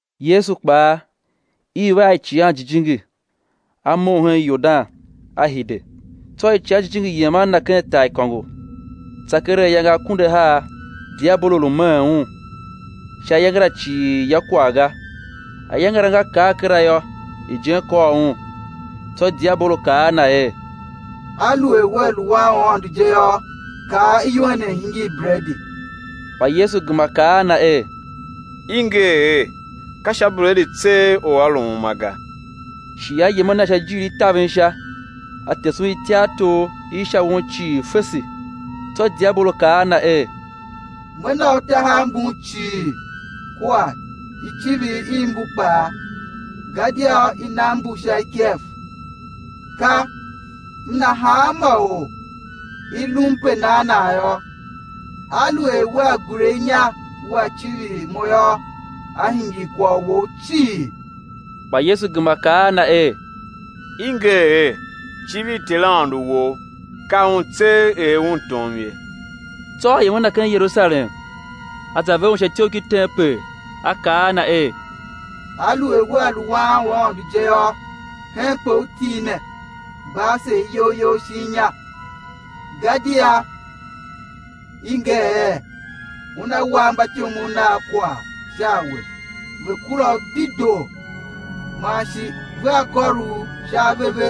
Yesu kpaa, iv a Icighan Jijingi, A mough hen Yordan, A hide; tsô Icighan Jijingi yem a Na ken taaikôngo, tsa keregh ayange akunduahar, diabolo lu meen Un; sha ayange la cii ya kwagh ga. Ayange la nga kar kera yô, ijen kôr Un. Tsô diabolo kaa a Na er: Aluer Wea lu Wan u Aôndo je yô, kaa iwen ne i̱ hingir bredi. Kpa Yesu gema kaa a na er: I nger er: Ka sha bredi tseegh or á lu uma ga. Shi a yem a Na sha ijiir i taven sha a tese Un ityartor i sha won cii fese. Tsô diabolo kaa a Na er: Me na U tahav mbun cii kua icivir i mbu kpaa gadia i nam mbu sha ikev; ka m na hanma or u i lum pe nan nan yô. Aluer Wea gure inya Wea civir mo yô, á hingir kwagh Wou cii. Kpa Yesu gema kaa a na er: I nger er: Civir Ter Aôndo wou, ka Un tseegh er Un tom ye. Tsô a yem a Na ken Yerusalem a za ver Un sha ityough ki tempel, a kaa a Na er: Aluer Wea lu Wan u Aôndo je yô, henpe U til ne, gba ase iyol You shin inya, gadia i nger er: Una wa mbatyomov Nav kwagh sha a We, ve̱ kura U dedoo, man shi: Vea kôr U sha ave ve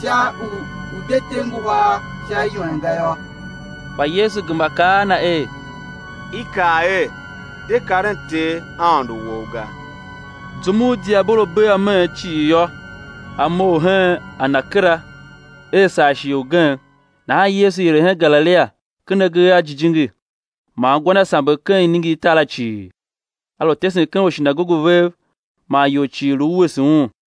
sha u U̱ de te nguhar sha iwen ga yô. Kpa Yesu gema kaa a na er: I kaa er: De karen Ter, Aôndo wou, ga. Zum u diabolo bee ameen cii yô, a mough hen a Na kera er saa shighe ugen. Nahan Yesu hire hen Galilia ken agee a Jijingi, man gwa Na samber ken iningirtar la cii. A lu tesen ken ushinagoge vev man ior cii lu wuese Un.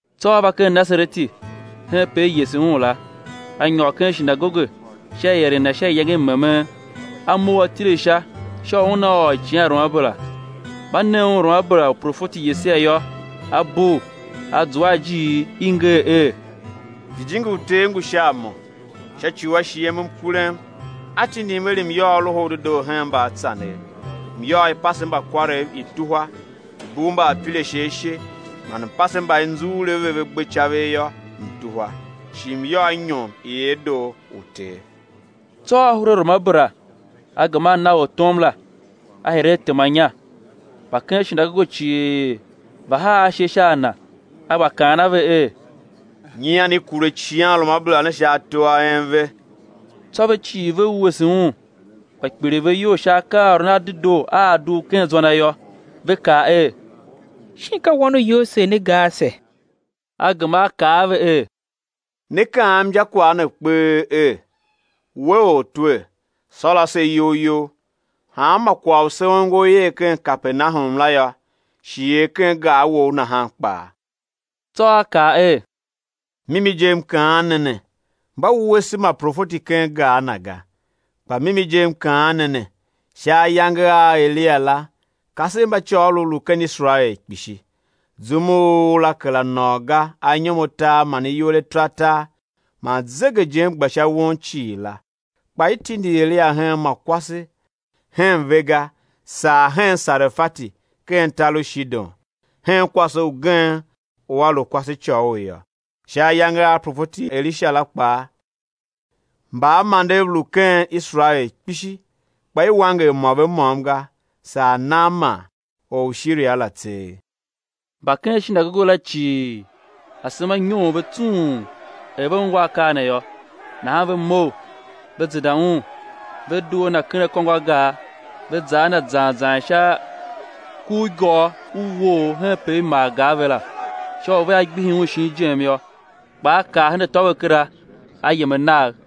Tsô A va ken Nasareti henpe i yese Un la. A nyôr ken shinagoge sha ieren Na sha iyange i memen; A mough A tile sha sha u Una ôr Icighanruamabera. Mba ne Un Ruamabera u profeti Yesaia yô, A bugh, A zua a ijiir i i nger er: Jijingi u Ter ngu sha a Mo, sha ci u A shighem mkurem, A tindim er M̱ yôô Loho u Dedoo hen mbaatsanev, M̱ yôô, i̱ pase mbakwarev, i̱ tuhwa, i̱ bugh mbaapirashe ashe, man M̱ pase mba i nzughul a ve ve gbe caver yô, M̱ tuhwa, shi M̱ yôô inyom i erdoo u Ter. Tsô A hure Ruamabera, A gema A na ortom la, A hire A tema inya. Mba ken shinagoge cii ve haa ashe sha a Na. A gba kaan a ve er: Nyian i kure icighanruamabera ne ken ato a en ve. Tsô ve cii ve wuese Un, gba kpiligh ve iyol sha akaaôron a dedoo a a dugh ken zwa Na yô, ve kaa er: Shin ka Wan u Yosev ne ga ase? A gema A kaa a ve er: Né kaam injakwagh ne kpee er: We Ortwer, sôr ase iyol You, hanma kwagh u se ongo i er ken Kapernahum la yô, shi er ken gar Wou nahan kpaa. Tsô A kaa er: Mimi je, M kaan ne ne, mba wuese ma profeti ken gar na ga. Kpa mimi je M kaan ne ne, sha ayange a Eliya la kasev mba côgholov lu ken Iserael kpishi, zum u ura kera nôô ga anyom atar man iwer ataratar, man zegejen gba sha won cii la. Kpa i tindi Eliya hen ma kwase hen ve ga saa hen Sarefati ken tar u Shidon, hen kwase ugen u a lu kwasecôghol yô. Sha ayange a profeti Elisha kpaa, mbaamandev lu ken Iserael kpishi, kpa i wanger mô ve môm ga, saa Naaman or u Shiria la tseegh. Mba ken shinagoge la cii, asema nyoon ve tsung er ve ungwa akaa ne yô. Nahan ve mough, ve zenda Un, ve due a Na ken akôngo a gar, ve za a Na zan zan sha kurigôr u uwoogh henpe i maa gar ve la, sha u vea gbihi Un shin ijem yô. Kpa A kar hen atô ve kera, A yem a Nagh.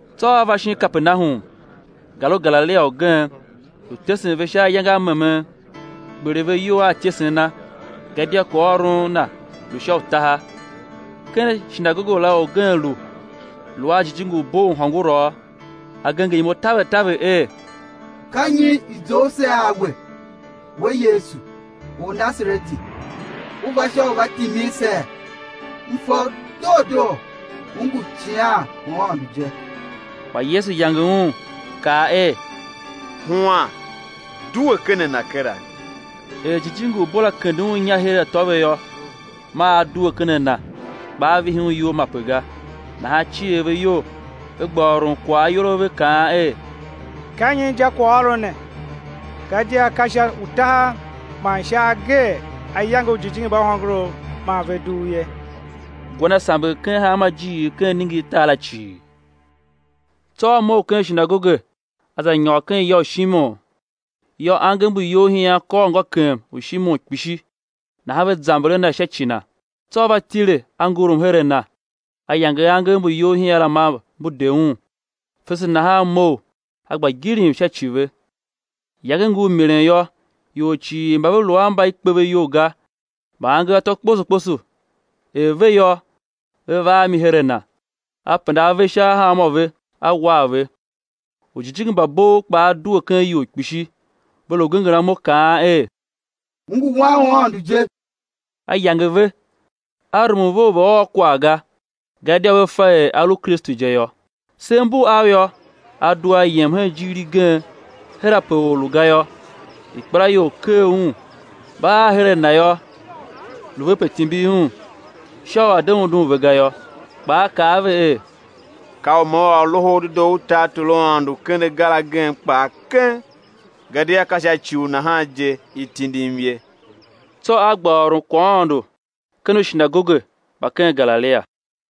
Tsô A va shin Kapernahum, gar u Galilia ugen, lu tesen ve sha ayange a memen. Kpiligh ve iyol a ityesen Na, gadia kwaghôron Na lu sha utaha. Ken shinagoge la orgen lu, lu a jijingi u bo u hôngorough, a genger imo taver taver er: Ka nyi i zough se a We, We Yesu, Ornasareti? U va sha u va timin see? M fa U doo doo, U ngu Icighan u Aôndo je. Kpa Yesu yange un, kaa er: Huan, due ken a na kera! Er jijingi u bo la kende un inya her atô ve yô, maa a due ken a na, kpa a vihi un iyol mape ga. Nahan cier ve iyol ve gba ôron kwagh ayol a ve kaan er: Ka nyi injakwaghôron ne? Gadia ka sha utaha man sha agee A yange ujijingi mba hôngorough man ve dugh ye. Gwa Na samber ken hanma ijiir ken iningirtar la cii. Tsô A mough ken shinagoge a za nyôr ken ya u Shimon. Yô, angev mbu iyolhian kôr ngôkem u Shimon kpishi; nahan ve zamber a Na sha ci na. Tsô A va tile A ngurum her a na, A yange angev mbu iyolhian la maa mbu de un; fese nahan a mough, a gba gilim sha sha ci ve. Iyange ngur milen yô, ior cii mba ve lu mba i kpe ve iyol ga mba angev atô kposo kposo er ve yô, ve va a mi her a Na. A penda ave sha hanmô ve, A war ve. Ujijingi mba bov kpaa due ken ior kpishi, ve lu genger imo, kaan er: U ngu Wan u Aôndo je! A yange ve, A rumun ve u ve̱ ôr kwagh ga, gadia ve fa er A lu Kristu je yô. Sev mbu av yô, A due A yem hen ijiir igen her ape or lu ga yô; ikpelaior ker Un; mba ar her a Na yô, lu ve pe timbir Un, sha u A̱ de undun ve ga yô. Kpa A kaa a ve er: Ka u Me ôr Loho u Dedoo u tartor u Aôndo ken agar agen kpaa keng, gadia ka sha ci u nahan je i tindim ye. Tsô A gba ôron kwaghaôndo ken ushinagoge mba ken Galilia.